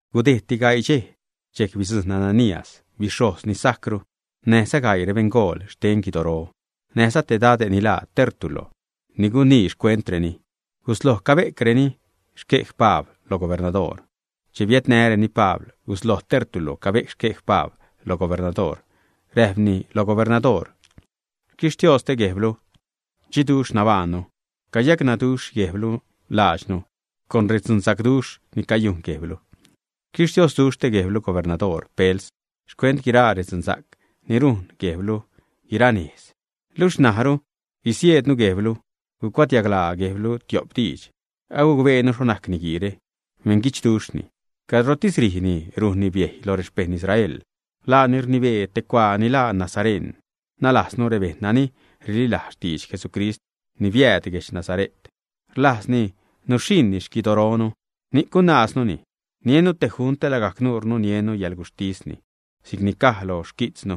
Gudejdti gaii dxej, dxejc bidzujṉ Ananías, bixhojz ni sajcru, näjza gaii rebeṉgool xten guidoro, näjza te dade' ni laa Tértulo ni gunii xcuentreni. Gusloj cabe'cni xquej Pabl lo gubernadoor. Che biädnäreni Pabl, gusloj Tértulo cabe'c xquej Pabl lo gubernadoor. Räjpni lo gubernadoor: ―Xquixtioste guejblu dxiduxh nabaṉnu. Cayacnäduxh guejblu laadxnu con redzunsacduxh ni cayujn guejblu. Xquixtiosduxh guejblu, gubernadoor Pels, xcuent guiraa redzunsa'c ni rujn guejblu guira nejz. Luxh na'cru gusieednu guejblu, gucuadiaglaa guejblu tiop diidx. Agucbeenu xho najc niguiire. Beṉguidxduxhni. Cadrotis ṟijni rujnni biejy lo rexpejṉ Israel. Laani rnibee te cuaa ni laa nasareṉ, nalajznu rebejṉ nani rililajz xtidx Jesucrist ni biääd guedx Nasare't. Rlajzlini nuxhiṉni xquidoronu, ni'c gunaaznuni. Niennu te junt te lagajc nuure niennu yäḻguxhtisni si'cni caj lo xquijtznu.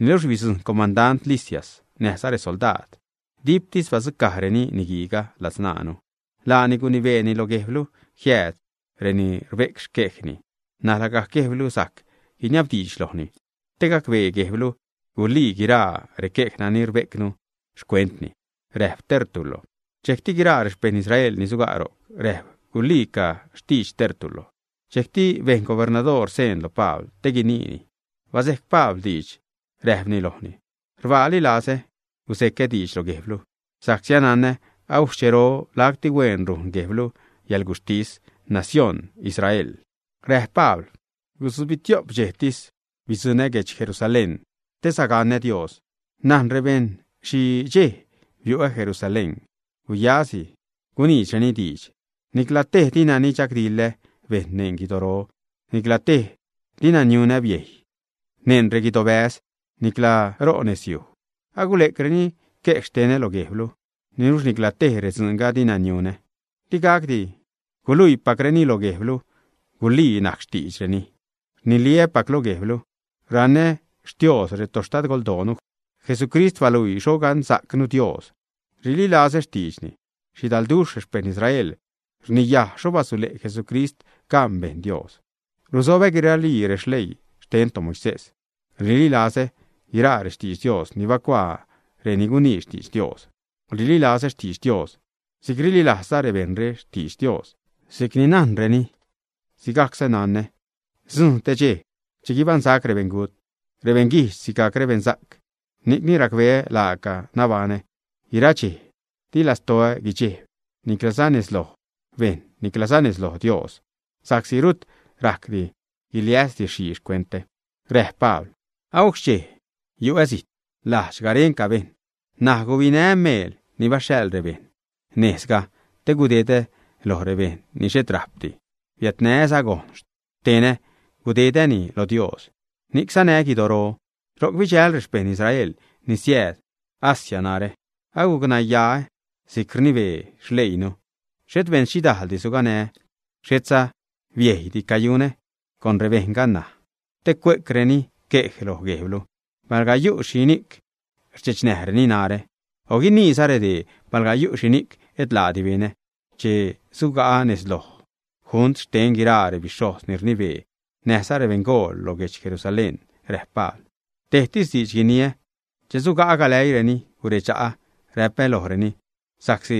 Niluxh bidzujṉ comandant Lisias näjza resoldaad. Diptis badzucajreni niguiiga ladzṉaanu. Laani gunibeeni lo guejblu jiääd reni rbe'c xquejni. N̲aj lagajc guejblu sajc guiniabdiidx lojni te gacbee guejblu gulii guiraa requej nani rbe'cnu xcuentni ―räjp Tértulo. Dxejcti guiraa rexpejṉ Israel ni suga' ro'c räjp guliica xtidx Tértulo. Dxejcti bejn gubernadoor seen lo Pabl te guiniini. Baze'c Pabl diidx, räjpni lojni: ―Rbaaliza lazä guze'cä diidx lo guejblu, sa'csi anana agujc xchero lacti huen rujn guejblu yäḻguxhtis nacióṉ Israelre ―räjp Pabl―. Gutzbitio'p dxejtis bidzuṉä guedx Jerusalén te sagaṉä Dios. Najn rebejṉ xhi dxej biu'ä Jerusalén, guyasi guniidxreni diidx. Nicla tej dina nichagdiḻä bejṉ neṉ guidoro. Nicla tej dina niunä biejy neṉ reguidobäz, nicla ro nezyuj. Agule'creni quej xtenä lo guejblu, niluxh nicla tej redzuunga dina niunä. Di gacdi guluipacreni lo guejblu gulii najc xtiidxreni. Rniliäpac lo guejblu: Raṉä Xtios retoxtadgoldoonu. Jesucrist baluii xho gaṉsa'cnu Dios. Rililazä rextiidxni. Xhidalduxh rexpejṉ Israel rniyaj xho basule' Jesucrist gaṉ bejṉ Dios. Ruzobä guiraali releii xten toMoisés. Rililazä guiraa rextidx Dios ni bacuaa reni gunii xtidx Dios. Rililazä xtidx Dios si'c rililajzza rebejṉre xtidx Dios. Si'c ni najnreni, si'cza nanä sidzujṉ te dxej che guibaṉsac rebeṉgut, rebeṉguijdx sigajc rebeṉsa'c. Ni'cni racbeä laaca nabaṉä guiraa dxej, di lastoä guidxejb, nicla nez loj bejṉ niclaza nez loj Dios, sa'csi rut rajcdi guiliäs dixhii xcuentä. Räjp Pabl: ―Agujc xchej yu'ä zijt, lajdx garenca bejṉ, ṉaj gubinää́ meel ni baxhaḻ rebeṉ nejzga te gudedäni lo rebejṉ ni xhet rajpdi. Biädnää́za gojn xtenä gudedäni lo Dios. Ni'c sanää́ guidoro. Ro'c bidxäjl rexpejṉ Israel ni siääd Asia narä. Agucnayaä si'c ni rnibee xleiinu. Xhet beṉxhidajldi suganää́, xhetza biejydi cayunä. ¿Con rebejṉga ṉaj? Te cue'creni quej lo guejblu palga yu' xhini'c rdxechnäjreni narä. O guiniiza redee palga yu' xhini'c et laadi benä che suga'ä nez loj junt xten guiraa rebixhojz ni rnibee näjza rebeṉgool lo guedx Jerusalén ―räjp Pabl―. Tejtis diidx guniä che suga'ä galäiireni, guredxa'a räpä lojreni: sa'csi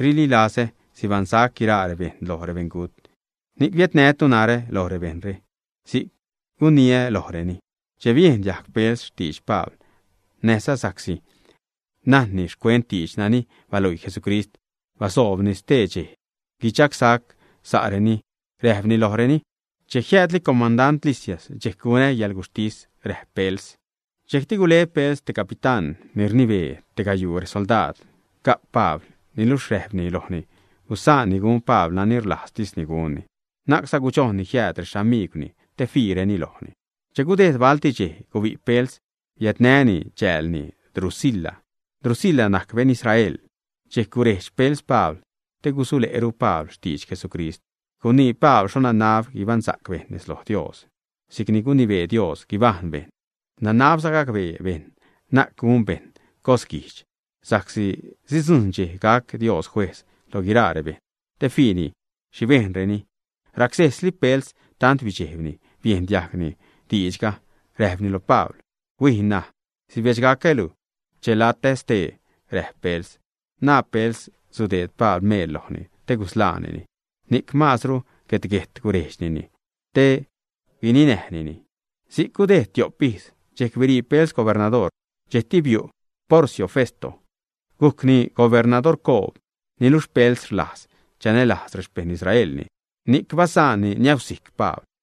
rililazä sibaṉsac guiraa rebejṉ lo rebeṉgut, ni'c biädnätu narä lo rebejṉre ―si'c guniä lojreni. Che biejn diajg Pels xtidx Pabl näjza sa'csi najne'ni xcuent diidx nani baluii Jesucrist, basoobni stee dxej guidxagsac sa'reni räjpni lojreni: ―Che jiäädli comandant Lisias dxejc gunä yäḻguxhtis ―räjp Pels. Dxejcti gule Pels te capitán ni rnibee te gayuu resoldaad ga'p Pabl. Niluxh räjpni lojni gusaanni gun Pabl nani rlajztisni gunni. Na'cza gudxojnni jiääd rexamigwni te fiireni lojni. Che gudejd balti dxej, gubi' Pels, biädnäni chäälni Drusila. Drusila najc beṉ Israel. Dxejc gurejdx Pels Pabl te gusule'ru Pabl xtidx Jesucrist. Gunii Pabl xho nanab guibaṉsa'c bejṉ nez loj Dios si'c ni gunibee Dios guibajṉ bejṉ. Nanabza gacbee bejṉ na'c gun bejṉ cos guijdx, sa'csi sidzujṉ dxej gac Dios juejz loj guiraa rebejṉ te fiini xhi bejnreni. Racsesli Pels tant bidxejbni biejn diajgni diidxga. Räjpni lo Pabl: ―Huij ṉaj. Sibedxsacälu che latä stee ―räjp Pels. Naa Pels sudeed Pabl meel lojni te gusḻaanini, ni'c masru guet-guejt gurejdxnini te guninäjnini. Si'c gudejd tiop ijz. Dxejc birii Pels gubernadoor. Dxejcti biu' Porcio Festo, gujcni gubernadorcoob. Niluxh Pels rlajz chanälajz rexpejṉ Israelni, ni'c basa'nni niäusijc Pabl.